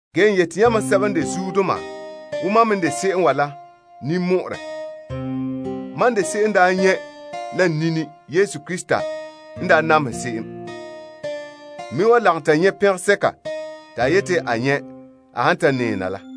N kan'ane yamam sɛba n de keema wo mam me n de se'em la. Mam n de se'em n daa nyɛ' la n nini Krista n daa namehegɔ. N me wan lagom ta nyɛ' na'ahegɔ sɛko n wan nɛɛ na la.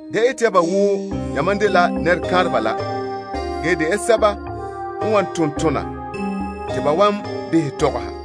Da ete ya ba wo yamam dela nɛrekanreba la. Ge de ya sɛba n wan ton tona te ba wan behɛ tɔgɔha.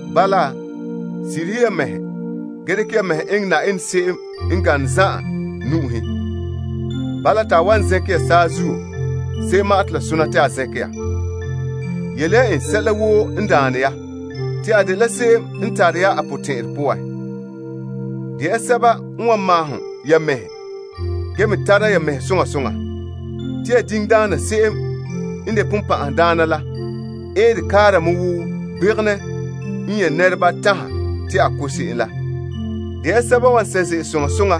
Bala, sirihe ya mɛhe ge dekɛ ya mɛhe eŋɛ Na'ayenɛ se'em n gane zan'an nu'uhen. Bala, te a wan zɛnkɛ ya saazuo se'em ma'an te la sona te a zɛnkɛ ya. Yele ya en sɛla woo n daane ya. Te a dela se'em n tare ya a potɛn'ɛrɛ poan. De ya sɛba n wan maahom ya mɛhe, ge me tara ya mɛhe soŋa soŋa. Te ya diŋdaana se'em n de Sagona la eere kaara mɛ wo gbegenɛ n nyɛ' nɛreba tanha te a ko' se'em la. De ya sɛba n wan sɛ' ze'ele soŋa soŋa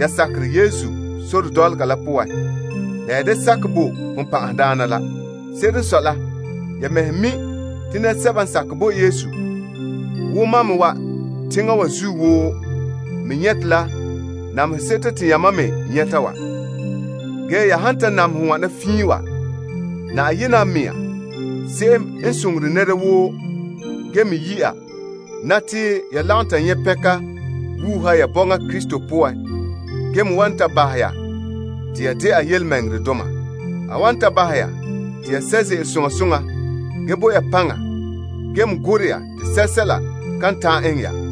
ya sakerɛ Yesu sore dɔlɔga la poan la ya da sakɛ bo ya Sagona la. Se'ere n sɔe la, ya mɛhe mi' te Yesu dɔlɔba sɛba woo me n boe teŋa wa zuo me nyɛte la namehe seto te yamam me nyɛta wa. Ge ya han ta namehɛ wana fiin wa, Na'ayenɛ n de zo'ohogɔ zan'an Yenɛ la ge yi' ya na te ya lagom ta nyɛ' pɛnka wuuha ya bɔŋa Krista poan ge me wan ta bahɛ ya te ya dɛna yelemɛŋɛrɛdoma. A wan ta bahɛ ya te ya sɛ' ze'ele soŋa soŋa ge bo ya paŋa ge me gorɛ ya te sɛla kan ta'an eŋɛ ya.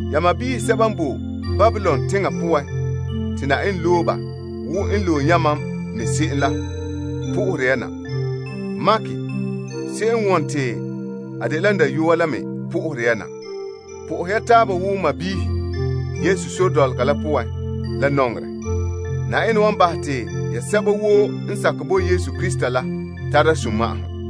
Ya sɔɔnrɔ sɛba n boe Babilon teŋa poan te Na'ayenɛ loe ba wo n loe yamam me se'em la po'ohere ya na. Mark se'em n wone te a dela n dayɔa la me po'ohere ya na. Po'ohɛ ya taaba wo sɔɔnrɔ Yesu sore dɔlɔga la poan la nɔŋerɛ. Na'ayenɛ wan bahɛ te ya sɛba woo n sakɛ bo Yesu Krista la tara sunma'ahom.